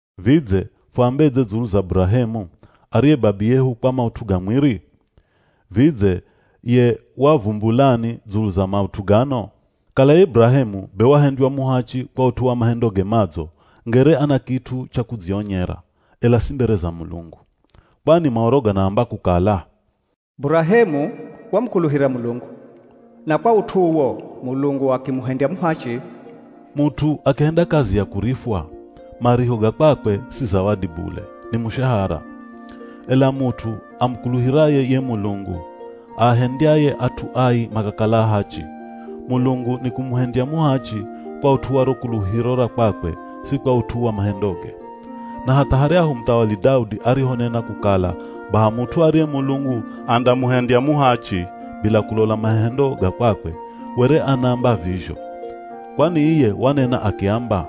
Vidze fuambedze dzulu za Burahemu, ariye babiyehu kwa maut'u ga mwiri? Vidze ye wavumbulani dzulu za maut'u gano? Kala ye Burahemu be wahendywa muhachi kwa ut'u wa mahendoge madzo ngere ana kit'u cha kudzionyera, ela si mbere za Mulungu. Kwani Maoro ganaamba kukala, “Burahemu wamukuluhira Mulungu, na kwa ut'u uwo Mulungu akimuhendya muhachi.” Mut'u akihenda kazi ya kurifwa, mariho ga kwakwe si zawadi bule, ni mushahara. Ela mut'u amukuluhiraye ye Mulungu aahendyaye at'u ai makakala ahachi, Mulungu nikumuhendya muhachi kwa ut'u wa ro kuluhiro ra kwakwe si kwa ut'u wa mahendoge. Na hatha haryahu muthawali Daudi arihonena kukala baha mut'u ariye Mulungu andamuhendya muhachi bila kulola mahendo ga kwakwe, were anaamba vizho. Kwani iye wanena akiamba,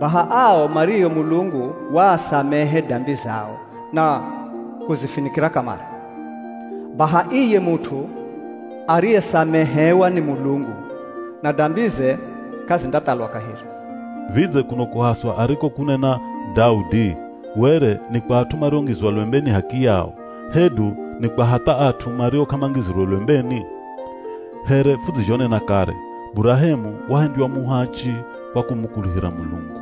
“Baha ao mario Mulungu waasamehe dambi zao na kuzifinikira kamare. Baha iye mut'u ariyesamehewa ni Mulungu na dambize k'azindathalwa kaheri.” Vidze kuno kuhaswa arikokunena Daudi, were ni kwa at'u mariongizwa lwembeni h'akiyao hedu ni kwa hatha at'u mario k'amangizirwe lwembeni? Here fudzizhonena kare, Burahemu wahendywa muhachi kwa kumukuluhira Mulungu.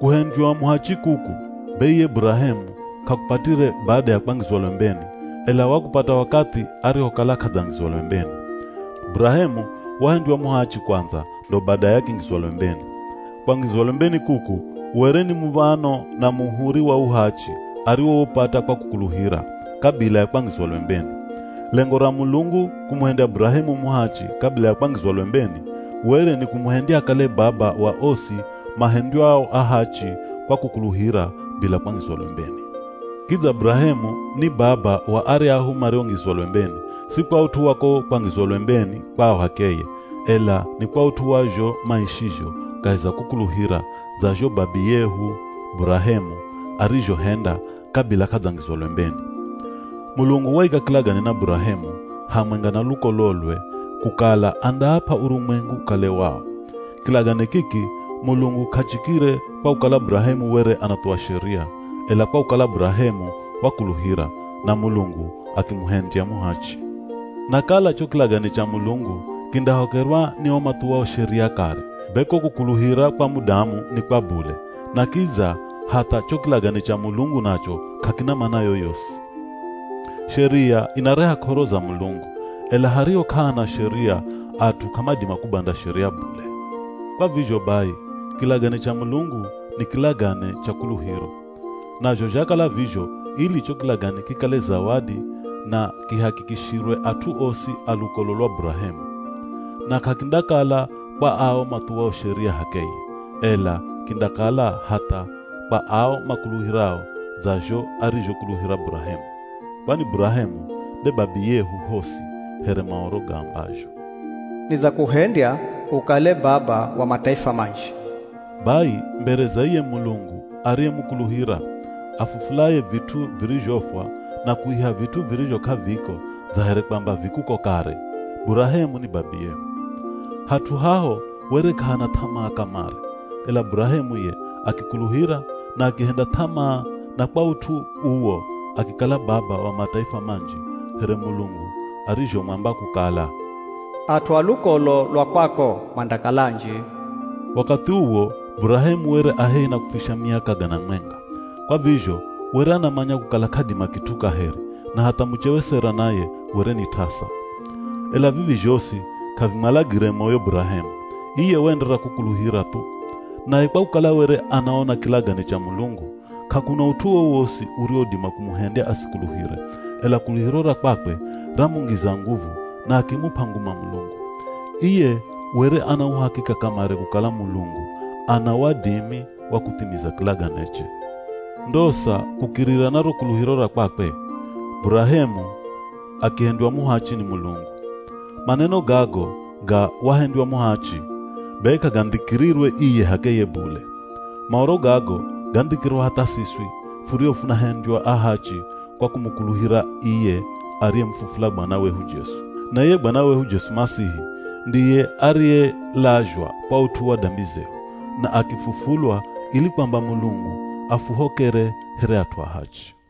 Kuhendywa muhachi kuku, be iye Burahemu k'akupatire bada ya kwangizwa lwembeni, ela wakupata wakathi arihokala k'adzangizwa lwembeni. Burahemu wahendywa muhachi kwandza ndo badaye akingizwa lwembeni. Kwangizwa lwembeni kuku were ni muv̱ano na muhuri wa uhachi ariwoupata kwa kukuluhira, kabila ya kwangizwa lwembeni. Lengo ra Mulungu kumuhendya Burahemu muhachi kabila ya kwangizwa lwembeni, were ni kumuhendya akale baba wa osi mahendywao ahachi kwa kukuluhira bila kwangizwa lwembeni. Kidza Burahemu ni baba wa aryahu mariongizwa lwembeni, si kwa ut'u wa ko kwangizwa lwembeni kwao h'akeye, ela ni kwa ut'u wa zho maishizho kahi za kukuluhira dza zho babiyehu Burahemu arizhohenda kabila k'adzangizwa lwembeni. Mulungu waika kilagane na Burahemu hamwenga na lukololwe kukala andaap'a urumwengu ukale wao. Kilagane kiki Mulungu k'achikire kwa kukala Burahemu were anathuwa Sheria, ela kwa kukala Burahemu wakuluhira, na Mulungu akimuhendya muhachi. Na kala cho kilagane cha Mulungu kindahokerwa ni o mathuwao Sheria kare, be ko kukuluhira kwa mudamu ni kwa bule, na kidza hatha cho kilagane cha Mulungu nacho k'akina mana yoyosi. Sheria inareha k'oro za Mulungu. Ela hariho k'ahana Sheria at'u k'amadima kubanda Sheria bule. Kwa vizho bai, kilagane cha Mulungu ni kilagane cha kuluhiro. Nazho zhakala vizho ili cho kilagane kikale zawadi na kihakikishirwe at'u osi a lukolo lwa Burahemu. Na k'akindakala kwa ao mathuwao Sheria h'akeye, ela kindakala hatha kwa ao makuluhirao dza zho arizhokuluhira Burahemu. Kwani Burahemu nde babiyehu hosi here Maoro gaambazho, “Nidzakuhendya ukale baba wa mataifa manji.” Bai, mbere za iye Mulungu ariyemukuluhira, afufulaye vit'u virizhofwa na kuiha vit'u virizho k'aviko dza here kwamba vi kuko kare, Burahemu ni babiyehu. Hat'u haho were k'ahana th'amaa kamare, ela Burahemu ye akikuluhira na akihenda th'amaa na kwa ut'u uwo akikala baba wa mataifa manji here Mulungu arizhomwamba kukala, “At'u a lukolo lwa kwako mandakala anji.” Wakathi uwo Burahemu were a hehi na kufisha miaka gana mwenga, kwa vizho were anamanya kukala k'adima kit'u kaheri na hatha muchewe Sera naye were ni t'asa. Ela vivi zhosi k'avimwalagire moyo Burahemu, iye waenderera kukuluhira thu. Naye kwa kukala were anaona kilagane cha Mulungu, k'akuna ut'u wowosi uriwodima kumuhendya asikuluhire, ela kuluhiro ra kwakwe ramungiza nguvu na akimup'a nguma Mulungu. Iye were ana uhakika kamare kukala Mulungu ana wadimi wa kuthimiza kilaganeche. Ndosa kukirira na ro kuluhiro ra kwakwe, Burahemu “akihendywa muhachi ni Mulungu.” Maneno gago ga, “wahendywa muhachi” be k'agandhikirirwe iye h'akeye bule. Maoro gago gandhikirwa hatha siswi furio funahendywa ahachi kwa kumukuluhira iye ariyemufufula Bwana wehu Jesu. Na iye Bwana wehu Jesu Masihi, ndiye ariyelazhwa kwa ut'u wa dambi zehu, na akifufulwa ili kwamba Mulungu afuhokere here at'u ahachi.